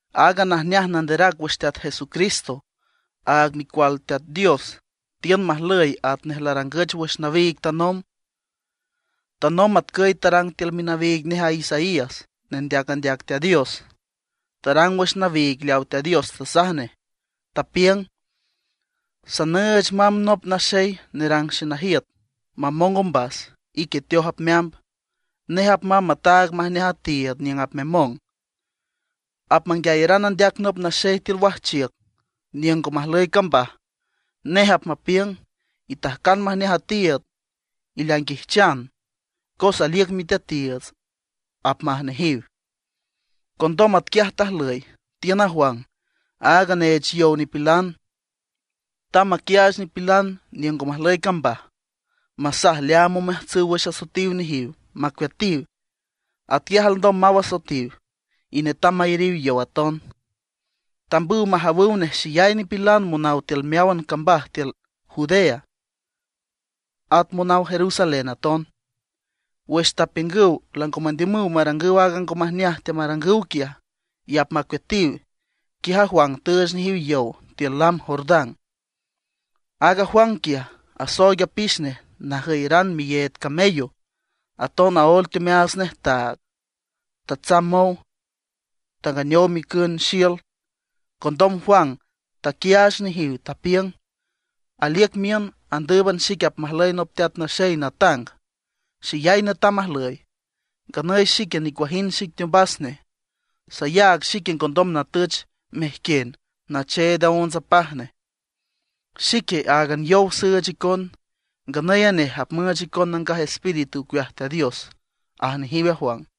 Aaga najneaj nanderac wüx Teat Jesucristo, aag Micual Teat Dios, tiün majlüy atnej larangüch wüx nawiig tanomb. Tanomb atcüy tarang tiül minawiig nej a Isaías, nendeac andeac Teat Dios. Tarang wüx nawiig leawa Teat Dios tasaj nej, tapiüng: Sanüüch mamb nop naxey nerang xenajiüt mamong ombas, ique teoj apmeamb. Nej apmamb mataag majneaj a tiiüd niüng apmemong. Apmanguiayaran andeac nop naxey tiül wajchiüc niüng ngo majlüy cambaj. Nej apmapiüng: “Itajcan majneaj a tiiüd, ileainguijchan, cos aliüc Miteatiiüts”, apmaj nejiw. Condom atquiaj tajlüy, tiün a Juan, aaga neech yow nipilan. Tamb maquiaach nipilan niüng ngo majlüy cambaj, masaj leaam omeajtsüw wüx asoetiw nejiw, macueatiw. Atquiaj alndom maw asoetiw, y netam mayariw yow aton. Tambüw majawüw nej xeyay nipilan monaw tiül meáwan cambaj tiül Judea, at monaw Jerusalén aton. Wüx tapiüngüw lango mandiümüw marangüw aaga ngo majneaj teamarangüw quiaj, y apmacueatiw, quiaj Juan tüüch nejiw yow tiül lam Jordán. Aaga Juan quiaj asooig apix nej najüyaran miyeed camello, aton aóel teomeaats nej taag. Tatsamb mow, tanganeow micün xiül. Condom Juan taquiaach nejiw, tapiüng: ―Aliüc miün andǘüban xic apmajlüy nop teat naxey natang, xeyay netam ajlüy; nganüy xique nicuajind xic teombas nej. Sayaag xique ngondom natüch mejquien nacheed aonts apaj nej. Xique áagan yow süüch icon, nganüy a nej apmüüch icon Nangaj Espíritu ocueaj Teat Dios ―aj nejiw a Juan.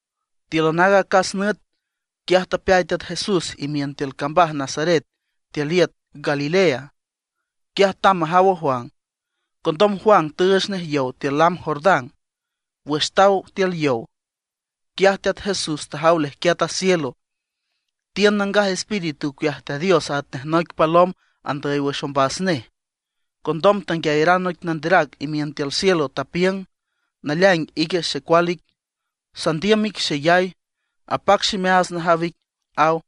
Tíülan aaga acas nüt, quiaj tapeay Teat Jesús imiün tiül cambaj Nazaret tiül iüt Galilea. Quiaj tamb majaw a Juan. Condom Juan tüüch nej yow tiül lam Jordán. Wüx taw tiül yow, quiaj Teat Jesús tajaw leajquiat a cielo, tiün Nangaj Espíritu ocueaj Teat Dios atnej noic palom andüy wüx ombas nej. Condom tanguiayaran noic nanderac imiün tiül cielo, tapiüng: ―Naleaing ique xecual ic, sandiüm ic xeyay, apac ximeaats najaw ic ―aw.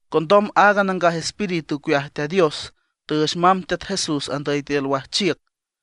Condom aaga Nangaj Espíritu ocueaj Teat Dios tüüch mamb Teat Jesús andüy tiül wajchiüc.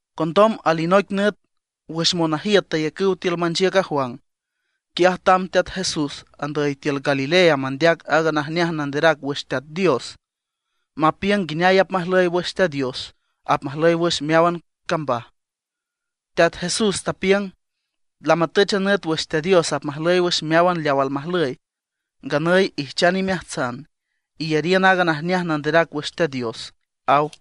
Condom alinoic nüt wüx monajiüt tayacüw tiül manchiüc a Juan, quiaj tamb Teat Jesús andüy tiül Galilea mandeac aaga najneaj nanderac wüx Teat Dios, mapiüng nguineay apmajlüy wüx Teat Dios apmajlüy wüx meáwan cambaj. Teat Jesús tapiüng: ―Lamatüch a nüt wüx Teat Dios apmajlüy wüx meáwan leaw almajlüy. Nganüy ijchan imeajtsan, iyariün aaga najneaj nanderac wüx Teat Dios ―aw.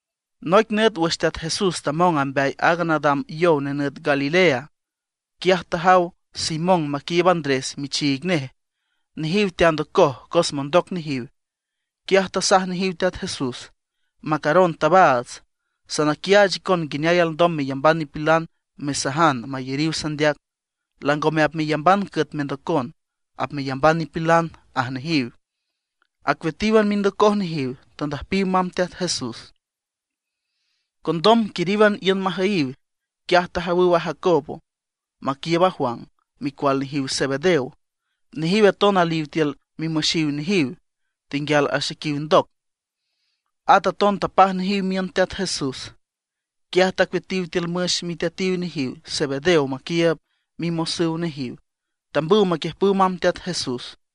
Noic nüt wüx Teat Jesús tamong amb mbeay aaga nadam yow nenüt Galilea, quiaj tajaw Simón maquiiüb Andrés michiig nej. Nejiw teandocoj cos mondoc nejiw. Quiaj tasaj nejiw Teat Jesús: ―Macaron tabaats, sanaquiaach icon nguineay alndom meyamban nipilan mesajan mayariw sandeac. Langome apmeyamban cüet mendocon, apmeyamban nipilan ―aj nejiw. Acueatíwan mindocoj nejiw, tandüjpiw mamb Teat Jesús. Condom quiríwan iün majüyiw, quiaj tajawüw a Jacobo maquiiüb a Juan, micual nejiw Zebedeo. Nejiw aton aliw tiül mimüxiw nejiw, tenguial axequiw ndoc. At aton tapaj nejiw miün Teat Jesús. Quiaj tacueatiw tiül müx miteatiw nejiw Zebedeo maquiiüb mimosüw nejiw. Tambüw maquiüjpüw mamb Teat Jesús.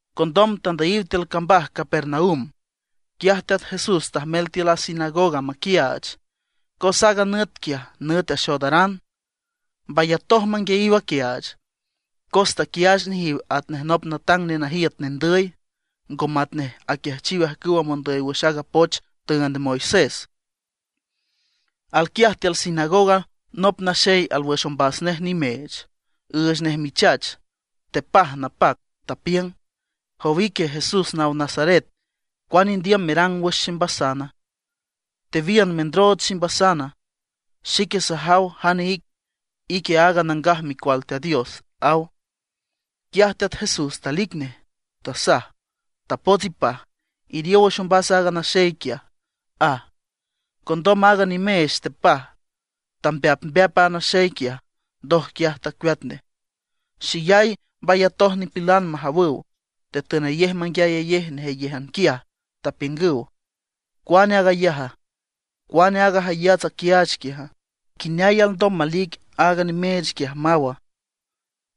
Condom tandüyiw tiül cambaj Capernaum. Quiaj Teat Jesús tajmel tiül a sinagoga maquiaach, cos aaga nüt quiaj nüt axoodaran. Mbayatoj manguiayiw aquiaach, cos taquiaach nejiw atnej nop natang nenajiüt nendüy, ngo matnej aquiajchiw ajcüwa mondüy wüx aaga poch tüünd Moisés. Alquiaj tiül sinagoga nop naxey alwüx ombas nej nimeech, üüch nej michach, tepaj napac. Tapiüng: ―Jow ique Jesús naw Nazaret, ¿cuane indiüm merang wüx ximbasana? ¿Tewiün mendrooch ximbasana? Xique sajaw jane ic, ique aaga Nangaj Micual Teat Dios ―aw. Quiaj Teat Jesús talic nej, tasaj: ―¡Tapots ipaj, iriow wüx ombas a naxey quiaj! ―aj. Condom aaga nimeech tepaj, tambeapmbeap a naxey quiaj, ndoj quiaj tacueat nej. Xeyay mbayatoj nipilan majawüw, tetünayej menguiayayej nejeyéjan quiaj, tapiüngüw: ―¿Cuane aag ayaja? ¿Cuane aaga jayats aquiaach quiaja? ¿Nguineay alndom malic aaga nimeech quiaj maw?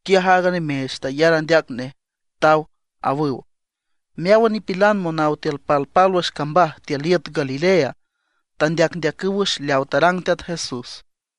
¡Quiaj aaga nimeech tayar andeac nej, taw! ―awüw. Meáwan nipilan monaw tiül palpálwüx cambaj tiül iüt Galilea tandeacndeacüw wüx leaw tarang Teat Jesús.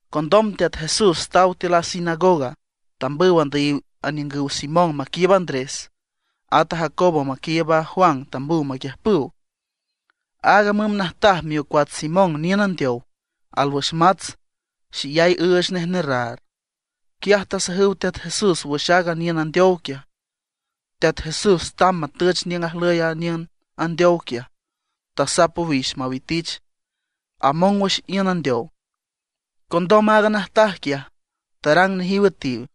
Condom Teat Jesús taw tiül a sinagoga, tambüw andüyiw aniüngüw Simón maquiiüb Andrés, at a Jacobo maquiiüb a Juan tambüw maquiüjpüw. Aaga müm najtaj miocuats Simón niün andeow, alwüx mats, xeyay üüch nej nerraar. Quiaj tasajüw Teat Jesús wüx aaga niün andeow quiaj. Teat Jesús tamb matüch niüng ajlüy a niün andeow quiaj, tasap owix mawitich; among wüx iün andeow. Condom aaga najtaj quiaj tarang nejiw üetiw.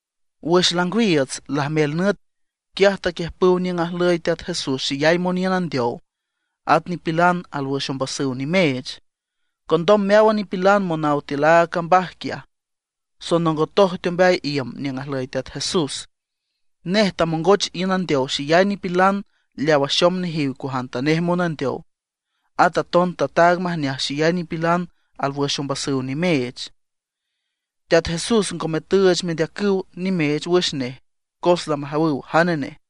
Wüx langwiiüts, lajmel nüt, quiaj taquiüjpüw niüng ajlüy Teat Jesús xeyay moniün andeow, at nipilan alwüx ombasüw nimeech. Condom meáwan nipilan monaw tiül aaga cambaj quiaj, sonongotoj teombeay iüm niüng ajlüy Teat Jesús. Nej tamongoch iün andeow xeyay nipilan leaw axom nejiw cuajantanej monandeow. At aton tataag majneaj xeyay nipilan alwüx ombasüw nimeech. Teat Jesús ngome tüüch mendeacüw nimeech wüx nej, cos lamajawüw jane nej.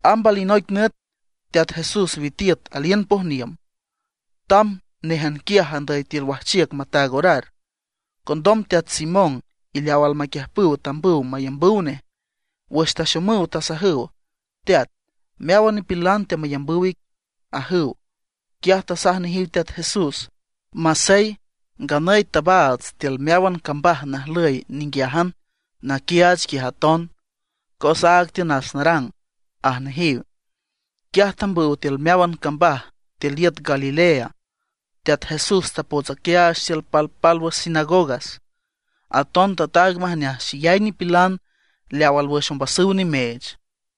Amb alinoic nüt Teat Jesús witiüt aliün pojniüm. Tamb néjan quiaj andüy tiül wajchiüc mataag orar. Condom Teat Simón y leaw almaquiüjpüw tambüw mayambüw nej. Wüx taxomüw, tasajüw: ―Teat, meáwan nipilan teamayambüw ic ―ajüw. Quiaj tasaj nejiw Teat Jesús: ―Masey, nganüy tabaats tiül meáwan cambaj najlüy ninguiájan naquiaach quiaj aton, cos áag tiünas narang ―aj nejiw. Quiaj tambüw tiül meáwan cambaj tiül iüt Galilea. Teat Jesús tapots aquiaach tiül palpálwüx sinagogas; aton tataag majneaj xeyay nipilan leaw alwüx ombasüw nimeech.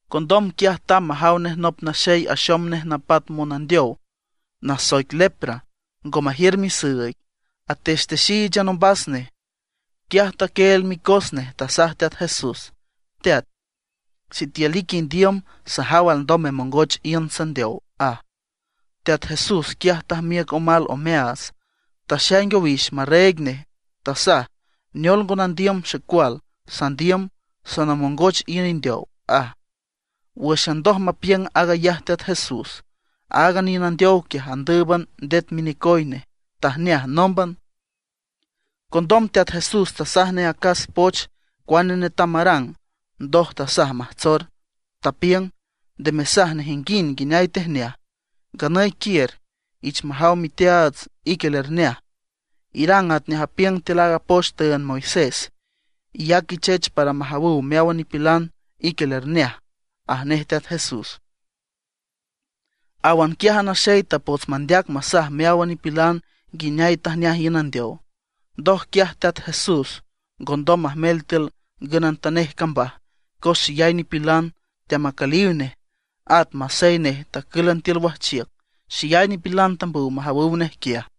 Condom quiaj tamb majaw nej nop naxey axom nej napat monandeow nasoic lepra, ngo majiür misüüig, atextexíichan ombas nej. Quiaj taquieel micos nej, tasaj Teat Jesús: ―Teat, sitiül ique indiüm sajaw alndom memongoch iün sandeow ―aj. Teat Jesús quiaj tajmiüc omal omeaats, taxaing owix marreeg nej, tasaj: ―Neol ngo nandiüm xecual, sandiüm, sanamongoch iün indeow ―aj. Wǘxan ndoj mapiüng aag ayaj Teat Jesús, aaga niün andeow quiaj andǘüban ndet minecoy nej, tajneaj nómban. Condom Teat Jesús tasaj nej acas poch cuane netam marang, ndoj tasaj majtsor. Tapiüng: ―Nde mesaj nejinguind nguineay tejneaj. Nganüy quiür, iich majaw miteaats ique lerjneaj; irang atnej apiüng tiül aaga poch tüünd Moisés. Iyac ichech para majawüw meáwan nipilan ique lerjneaj ―aj nej Teat Jesús. Áwan quiaj a naxey tapots mandeac masaj meáwan nipilan nguineay tajneaj iün andeow. Ndoj quiaj Teat Jesús ngondom majmel tiül ngünantanej cambaj, cos xeyay nipilan teamacüliw nej. At masey nej tacǘlan tiül wajchiüc, xeyay nipilan tambüw majawüw nej quiaj.